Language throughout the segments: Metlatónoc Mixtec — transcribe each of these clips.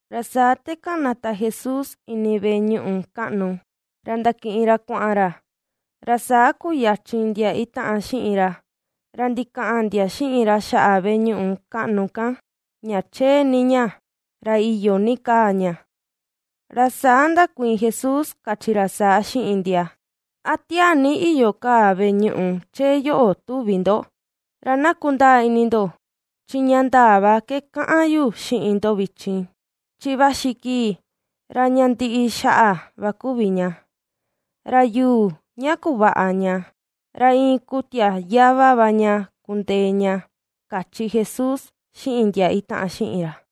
Ra saa te kanata Jesús ini veꞌe ñuꞌu kaꞌnu, ra ndakiꞌin ra kuaꞌan ra, ra saa kuyachin ndia itaꞌan xiꞌin ra, ra ndikaꞌan ndia xiꞌin ra xaꞌa veꞌe ñuꞌu kaꞌnu kan, ña chee ni ña, ra iyo ni kaa ña. Ra saa ndakuiin Jesús kachi ra saa xiꞌin ndia: ―¿A tiaa ni iyo kaa veꞌe ñuꞌu chee yoꞌo tuvi ndo? Ra na kundaa ini ndo chi ña ndaa va ke kaꞌan yu xiꞌin ndo vichin, chi vaxi kii ra ña ndiꞌi xaꞌa va kuvi ña, ra yuu ña kuvaꞌa ña, ra iin kutia yava va ña kundee ña ―kachi Jesús xiꞌin ndia itaꞌan xiꞌin ra.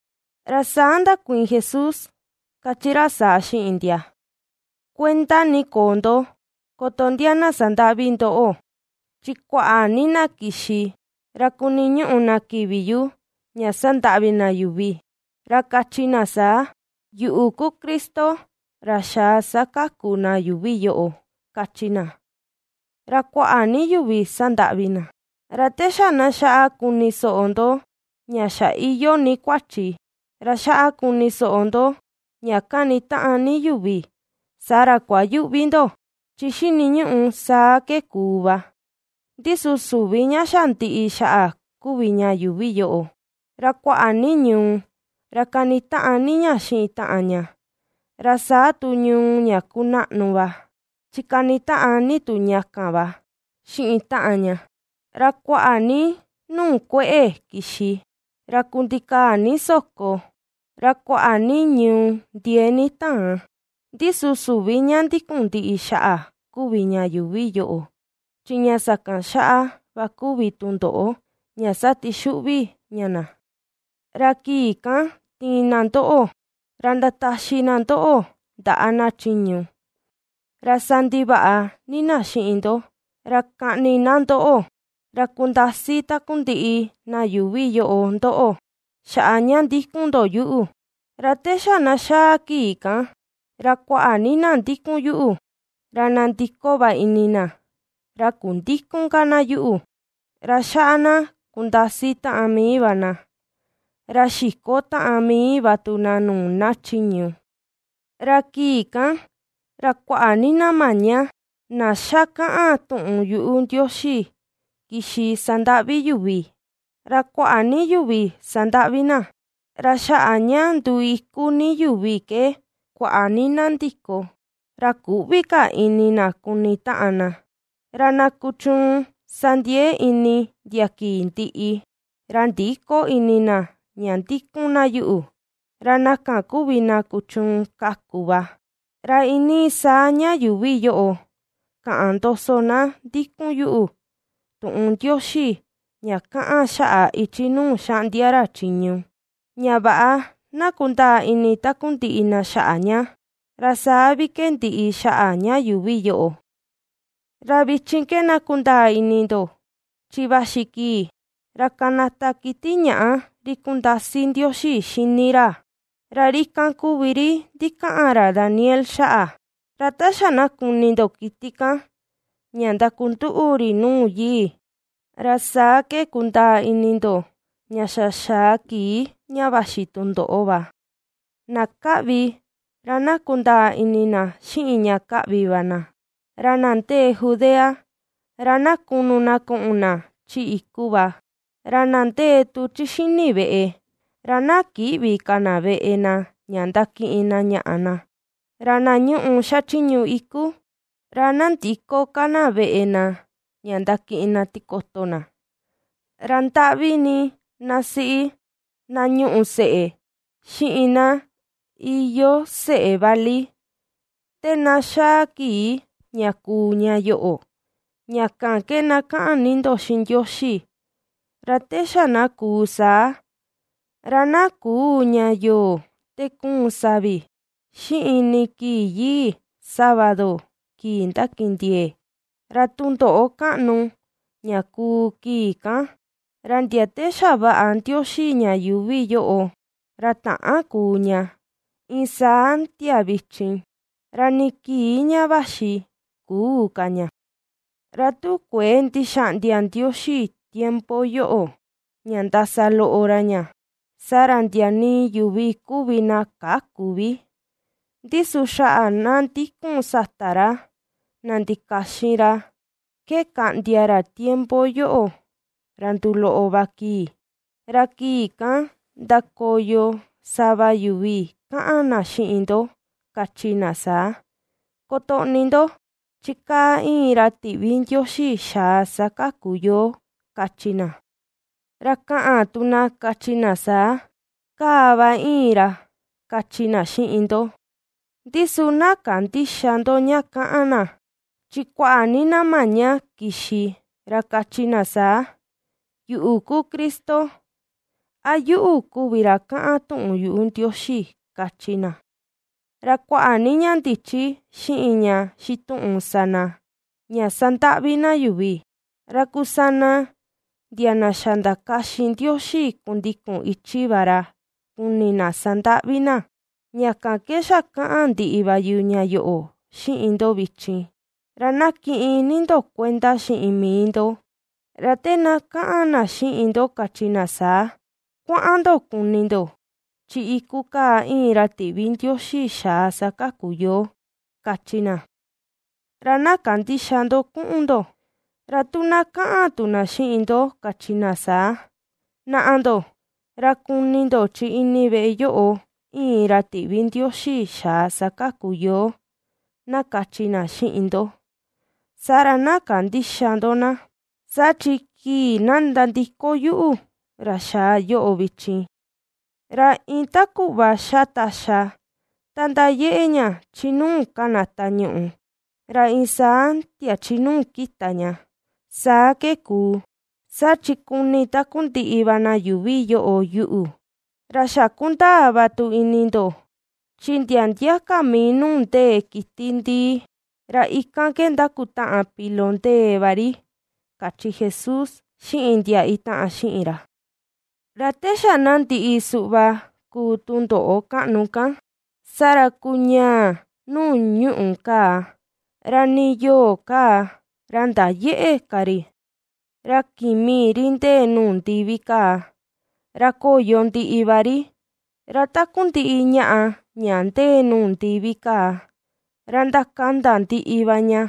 Ra saa ndakuiin Jesús kachi ra saa xiꞌin ndia: ―Kuenda ni koo ndo, koto ndia na sandaꞌvi ndoꞌo. Chi kuaꞌa ni na kixi ra kuniñuꞌu na kivi yu ña sandaꞌvi na yuvi, ra kachi na saa: “Yuꞌu ku Cristo ra xaa sakaku na yuuvi yoꞌo”, kachi na, ra kuaꞌa ni yuvi sandaꞌvi na. Ra te xa na xaꞌa kuni soꞌo ndo ña xa iyoo ni kuachi ra xaꞌa kuni soꞌo ndo ña kanitaꞌan ni yuvi saa ra kuayüꞌvi ndo, chi xiniñuꞌu saa ke kuu va. Ndi su süvi ña xa ndiꞌi xaꞌa kuvi ña yuuvi yoꞌo. Ra kuaꞌa ni ñuu ra kanitaꞌan ni ña xiꞌin taꞌan ña, ra saa tu ñuu ña kunaꞌnu va, chi kanitaꞌan ni tu ña kan va xiꞌin taꞌan ña; ra kuaꞌa ni nuu kueꞌe kixi, ra kundikaa ni soko, ra kuaꞌa ni ñuu ndiee ni taan. Ndi su süvi ña ndikun ndiꞌi xaꞌa kuvi ña yuuvi yoꞌo, chi ña sakan xaꞌa va kuvi tundoꞌo ña satixuꞌvi ña na. ’Ra kii kan tiin na ndoꞌo, ra ndataxi na ndoꞌo ndaꞌa na chiñu ra sandivaꞌa ni na xiꞌin ndo; ra kaꞌni na ndoꞌo, ra kundasi takundiꞌi na yuuvi yoꞌo ndoꞌo, xaꞌa ña ndikun ndo yuꞌu. Ra te xa na xaa kii kan, ra kuaꞌa ni na ndikun yuꞌu, ra nandiko va ini na, ra kundïkun ka na yuꞌu; ra xaꞌa na kundasi taꞌan mii va na, ra xiko taꞌan mii va tu na nuu na chiñu. Ra kii kan ra kuaꞌa ni na maña, na xa kaꞌan tuꞌun yuꞌu Ndioxi kixi sandaꞌvi yuvi, ra kuaꞌa ni yuvi sandaꞌvi na. Ra xaꞌa ña nduu ikú ni yuvi ke kuaꞌa ni na ndi̱kò, ra küꞌvi ka ini na kuni taꞌan na. Ra na kuchuun sa ndiee ini ndia kii ndiꞌi, ra ndïko ini na ña ndikun na yuꞌu, ra na kan ku vi na kuchuun kaku va. Ra iinii saa ña yuuvi yoꞌo kaꞌan ndoso na ndikun yuꞌu, tuꞌun Ndioxi ña kaꞌan xaꞌa ichi nuu xaꞌndia ra chiñu, ña vaꞌa na kundaa ini takundiꞌi na xaꞌa ña, ra saa vi ke ndiꞌi xaꞌa ña yuuvi yoꞌo. ’Ra vichin ke na kundaa ini ndo, chi vaxi kii ra kanata kiti ñaꞌa ri kundasi Ndioxi xini ra. Ra ri kan kuvi ri ndikaꞌan ra Daniel xaꞌa. Ra ta xa na kuni ndo kiti kan ña ndakunduꞌu ri nuu yii, ra saa ke kundaa ini ndo ña xa xaa kii ña vaxi tundoꞌo va ―na ^kaꞌvi, ra na kundaa ini na xiꞌin ña kaꞌvi va na―, ra na ndee Judea, ra na kunu na kuꞌun na chi iku va. Ra na ndee tu chi xini veꞌe, ra na kïꞌvi ka na veꞌe na, ña ndakiꞌin na ñaꞌa na. Ra na ñuꞌu xachiñu iku, ra na ndïko ka na veꞌe na ña ndakiꞌin na tikoto na. Ra ndaꞌvi ni na siꞌi na ñuꞌu seꞌe, xiꞌin na iyoo seꞌe vali, te na xaa kii ña kuu ña yoꞌo. Ña kan ke na kaꞌan ni ndo xiꞌin Ndioxi, ra te xa na kuu saa, ra na küu ña yoo te kuun savi, xiꞌin ni kii yii sábado kii ndakindiee. Ra tundoꞌo kaꞌnu ña kuu kii kan, ra ndia te xavaꞌa Ndioxi ña yuuvi yoꞌo, ra täan kuu ña, iin saa ndia vichin, ra nii kii ña vaxi küu ka ña. Ra tu kuëe ndixaꞌndia Ndioxi tiempo yoꞌo ña ndasa loꞌo ra ña, saa ra ndia nii yuvi kuvi na käku vi, ndi su xaꞌa na ndikun sata ra na ndikaxin ra ke kaꞌndia ra tiempo yoꞌo ra nduloꞌo va kii. ’Ra kii kan ndakoyo sava yuvi kaꞌan na xiꞌin ndo kachi na saa: “Kotoꞌni ndo, chi kaa iin ra tiꞌvi Ndioxi xaa sakaku yoo”, kachi na; ra kaꞌan tu na kachi na saa: “Kaa va iin ra”, kachi na xiꞌin ndo, ndi su na kandïxa ndo ña kaꞌan na. Chi kuaꞌa ni na maña kixi ra kachi na saa: “Yuꞌu ku Cristo”, a “Yuꞌu kuvi ra kaꞌan tuꞌun yuꞌu Ndioxi”, kachi na. Ra kuaꞌa ni ña ndichi xiꞌin ña xituꞌun sa na, ña sandaꞌvi na yuvi, ra kusana ndia na xa ndikaxin Ndioxi kundikun ichi va ra kuni na sandaꞌvi na. Ña kan ke xa kaꞌan ndiꞌi va yu ña yoꞌo xiꞌin ndo vichin, ra na kiꞌin ni ndo kuenda xiꞌin mii ndo. Ra te na kaꞌan na xiꞌin ndo kachi na saa: “Kuaꞌan ndo kuni ndo, chi iku kaa iin ra tiꞌvi Ndioxi xaa sakaku yoo”, kachi na; ra na kandïxa ndo kuꞌun ndo. Ra tu na kaꞌan tu na xiꞌin ndo kachi na saa: “Naꞌa ndo, ra kuni ndo chi ini veꞌe yoꞌo iin ra tiꞌvi Ndioxi xaa sakaku yoo”, na kachi na xiꞌin ndo, saa ra na kandïxa ndo na. Saa chi kii na nandiko yuꞌu ra xaa yoꞌo vichin ra iin ta kuꞌva xa taxa ta ndayeꞌe ña chi nuu kanata ñuꞌu ra iin saa ndia chi nuu kita ña, saa ke kuu, saa chi kuni takundiꞌi va na yuuvi yoꞌo yuꞌu. Ra xa kundaa va tu ini ndo, chi ndia ndia ka mii nuu ndee kiti ndìì, ra ikan ke ndakutaꞌan pilo ndee va ri ―kachi Jesús xiꞌin ndia itaꞌan xiꞌin ra. ’Ra te xa na ndiꞌi suꞌva kuu tundoꞌo kaꞌnu kan, saa ra kuñaa nuu ñuꞌù kaa, ra nii yoo kaa ra ndayëꞌe ka ri, ra kimi ri ndee nuu ndivi kaa, ra koyo ndiꞌi va ri, ra takundiꞌi ñaꞌa ña ndee nuu ndivi kaa ra ndakanda ndiꞌi va ña.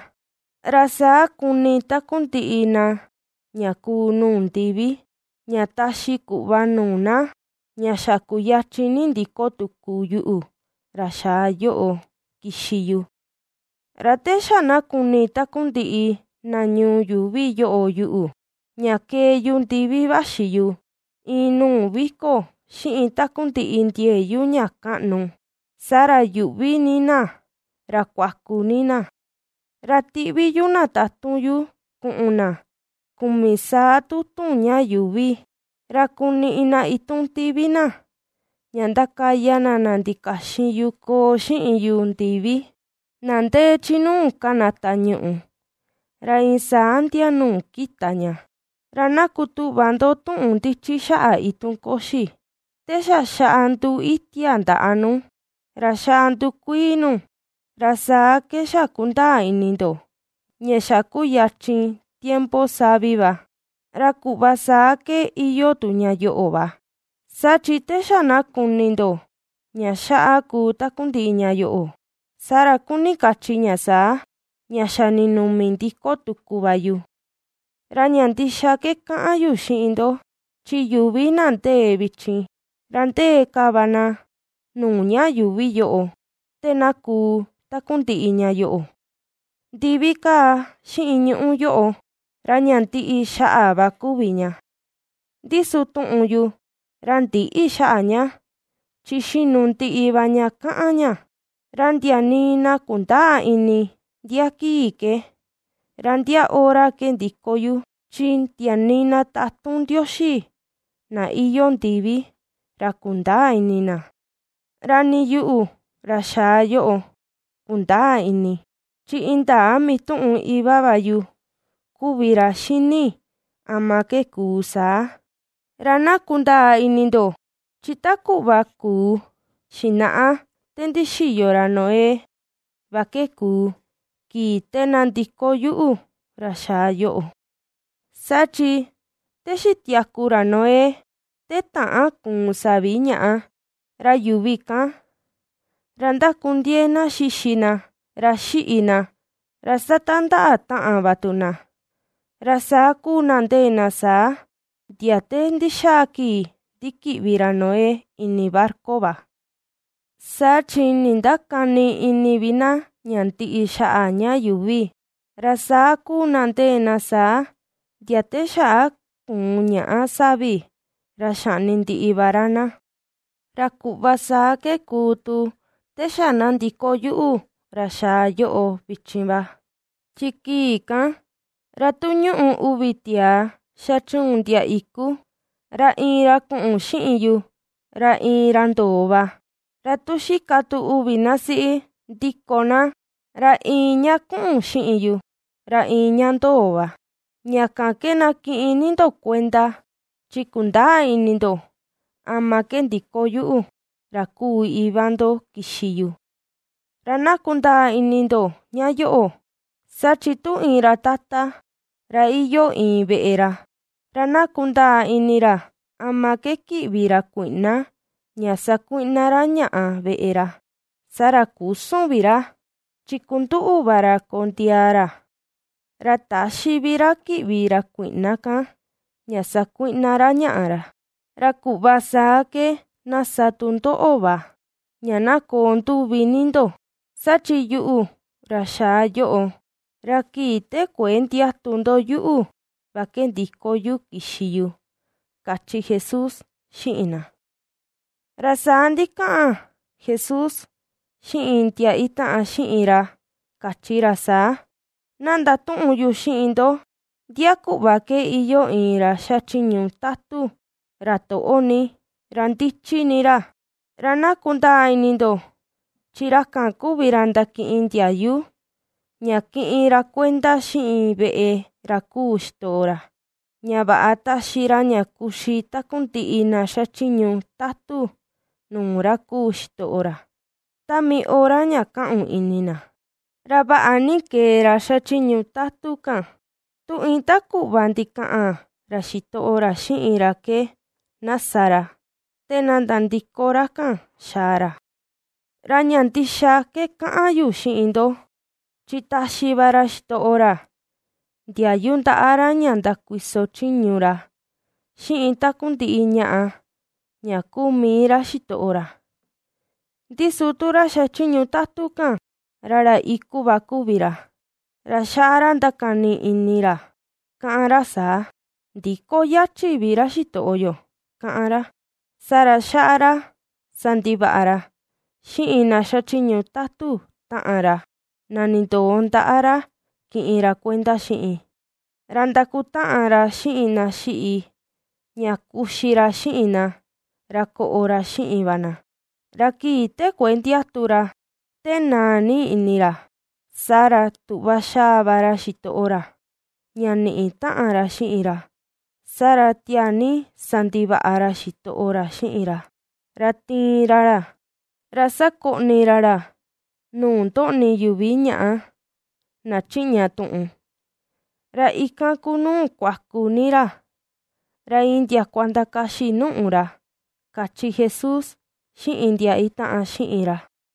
Ra saa kuni takundiꞌi na ña kuu nuu ndivi, ña taxi kuꞌva nuu na ña xa kuyachin ni ndiko tuku yuꞌu, ra xaa yoꞌo kixi yu. Ra te xa na kuni takundiꞌi na ñuu yuuvi yoꞌo yuꞌu, ña kee yu ndivi vaxi yu iin nuu viko xiꞌin takundiꞌi ndiee yu ña kaꞌnu, saa ra yuꞌvi ni na ra kuaku ni na. Ra tiꞌvi yu na tatun yu kuꞌun na kumi saa tutun ña yuuvi, ra kuniꞌi na itun tivi na, ña ndakaya na na ndikaxin yu koo xiꞌin yu ndivi, na ndee chi nu kanata ñuꞌu, ra iin saa ndia nuu kita ña. ’Ra na kutuꞌva ndo tuꞌun ndichi xaꞌa itun koxi: Te xa xaꞌa nduu itia ndaꞌa nu, ra xaꞌa ndukuii nu, ra saa ke xa kundaa ini ndo ña xa kuyachin tiempo savi va. Ra kuꞌva saa ke iyoo tu ña yoꞌo va, saa chi te xa na kuni ndo ña xaꞌa kuu takundiꞌi ña yoꞌo, saa ra kuni kachi ña saa, ña xa ninumi ndiko tuku va yu. Ra ña ndixa ke kaꞌan yu xiꞌin ndo, chi yuvi na ndee vichin ra ndee ka va na nuu ña yuvi yoꞌo, te na kuu takundiꞌi ña yoꞌo. ’Ndivi kaa xiꞌin ñuꞌú yoꞌo, ra ña ndiꞌi xaꞌa va kuvi ña, ndi su tuꞌun yu ra ndïꞌi xaꞌa ña, chi xinu ndiꞌi va ña kaꞌan ña. ’Ra ndia nii na kundäa ini ndia kii ke, ra ndia hora ke ndiko yu, chi ndia nii na tatun Ndioxi na iyoo ndivi ra kundäa ini na; ra nii yuꞌu, ra xaa yoꞌo, kundäa ini; chi indaa mituꞌun iva va yu kuvi ra xini ama ke kuu saa. Ra na kundaa ini ndo, chi ta kuꞌva kuu xinaꞌa, te ndixiyo ra Noé va ke kuu, kii te na ndiko yuꞌu ra xaa yoꞌo, saa chi te xitiaku ra Noé, te täan kuun savi ñaꞌa, ra yuvi kan, ra ndakundiee na xixi na, ra xiꞌi na, ra satandaꞌa taꞌan va tu na, ra saa kuu na ndee na saa, ndia te ndixaa kii ndikiꞌvi ra Noé ini barca va. Saa chi nindakäni ini vi na ña ndiꞌi xaꞌa ña yuuvi, ra saa kuu na ndee na saa, ndia te xaꞌa kuun ñaꞌa savi ra xaꞌni ndiꞌi va ra na. Ra kuꞌva saa ke kuu tu te xa na ndiko yuꞌu ra xaa yoꞌo vichin va. Chi kii kan, ra tu ñuꞌu uvi tiaa xachuun ndia iku, ra iin ra kuꞌun xiꞌin yu, ra iin ra ndoo va. Ra tu xika tu uvi na siꞌi, ndiko ná, ra iin ña kuꞌun xiꞌin yu, ra iin ña ndoo va. ’Ña kan ke na kiꞌin ni ndo kuenda, chi kundäa ini ndo ama ke ndiko yuꞌu, ra kuu Iva ndo kixi yu. Ra na kundaa ini ndo ña yoꞌo, saa chi tu iin ra tata, ra iyoo iin veꞌe ra, ra na kundaa ini ra ama ke kiꞌvi ra kuiꞌna ña sakuiꞌna ra ñaꞌa veꞌe ra, saa ra küsun vi ra, chi kunduꞌu va ra kondiaa ra, ra täxi vi ra kiꞌvi ra kuiꞌna kan ña sakuiꞌna ra ñaꞌa ra. Ra kuꞌva saa ke na sa tu ndoꞌo va, ña na koo nduvi ni ndo; saa chi yuꞌu ra xaa yoꞌo, ra kii te kuëe ndiatu ndo yuꞌu va ke ndiko yu kixi yu ―kachi Jesús xiꞌin na. Ra saa ndikaꞌan Jesús xiꞌin ndia itaꞌan xiꞌin ra kachi ra saa: ―Ná ndatuꞌun yu xiꞌin ndo ndia kuꞌva ke iyoo iin ra xachiñu tatu ra toꞌo ni, ra ndichi ni ra. Ra na kundaa ini ndo chi ra kan kuvi ra ndakiꞌin ndiayu ña kiꞌin ra kuenda xiꞌin veꞌe ra kuu xitoꞌo ra, ña vaꞌa taxi ra ña kuxi takundiꞌi na xachiñu tatu nuu ra kuu xitoꞌo ra, ta mii hora ña kaꞌun ini na. Ra vaꞌa ni kee ra xachiñu tatun kan, tu iin ta kuꞌva ndikaꞌan ra xitoꞌo ra xiꞌin ra ke, na sa ra, te na nandiko ra kan xaa ra. Ra ña ndixa ke kaꞌan yu xiꞌin ndo, chi taxi va ra xitoꞌo ra, ndiayu ndaꞌa ra ña ndakuiso chiñu ra xiꞌin takundiꞌi ñaꞌa, ña kuu mii ra xitoꞌo ra. Ndi su tu ra xachiñu tatu kan, ra ra iku va kuvi ra, ra xaꞌa ra ndakani ini ra kaꞌan ra saa: “Ndïko yachi vi ra xitoꞌo yo”, kaꞌan ra. Saa ra xaꞌa ra sandivaꞌa ra xiꞌin na xachiñu tatu taꞌan ra, na nindoo ndaꞌa ra kiꞌin ra kuenda xiꞌin. Ra ndakutaꞌan ra xiꞌin na xiꞌi, ña kuxi ra xiꞌin na, ra koꞌo ra xiꞌin va na. Ra kii te kuëe ndiatu ra, te naa ni ini ra, saa ra tuꞌva xaa va ra xitoꞌo ra, ña niꞌi taꞌan ra xiꞌin ra. Saa ra tiaa ni sandivaꞌa ra xitoꞌo ra xiꞌin ra, ra tiin ra ra, ra sakoꞌni ra ra nuu ndoꞌni yuvi ñaꞌa, na chiꞌña tuꞌun. Ra ikan kuu nuu kuaku ni ra, ra iin ndiakua ndakaxi nùꞌù ra ―kachi Jesús xiꞌin ndia itaꞌan xiꞌin ra.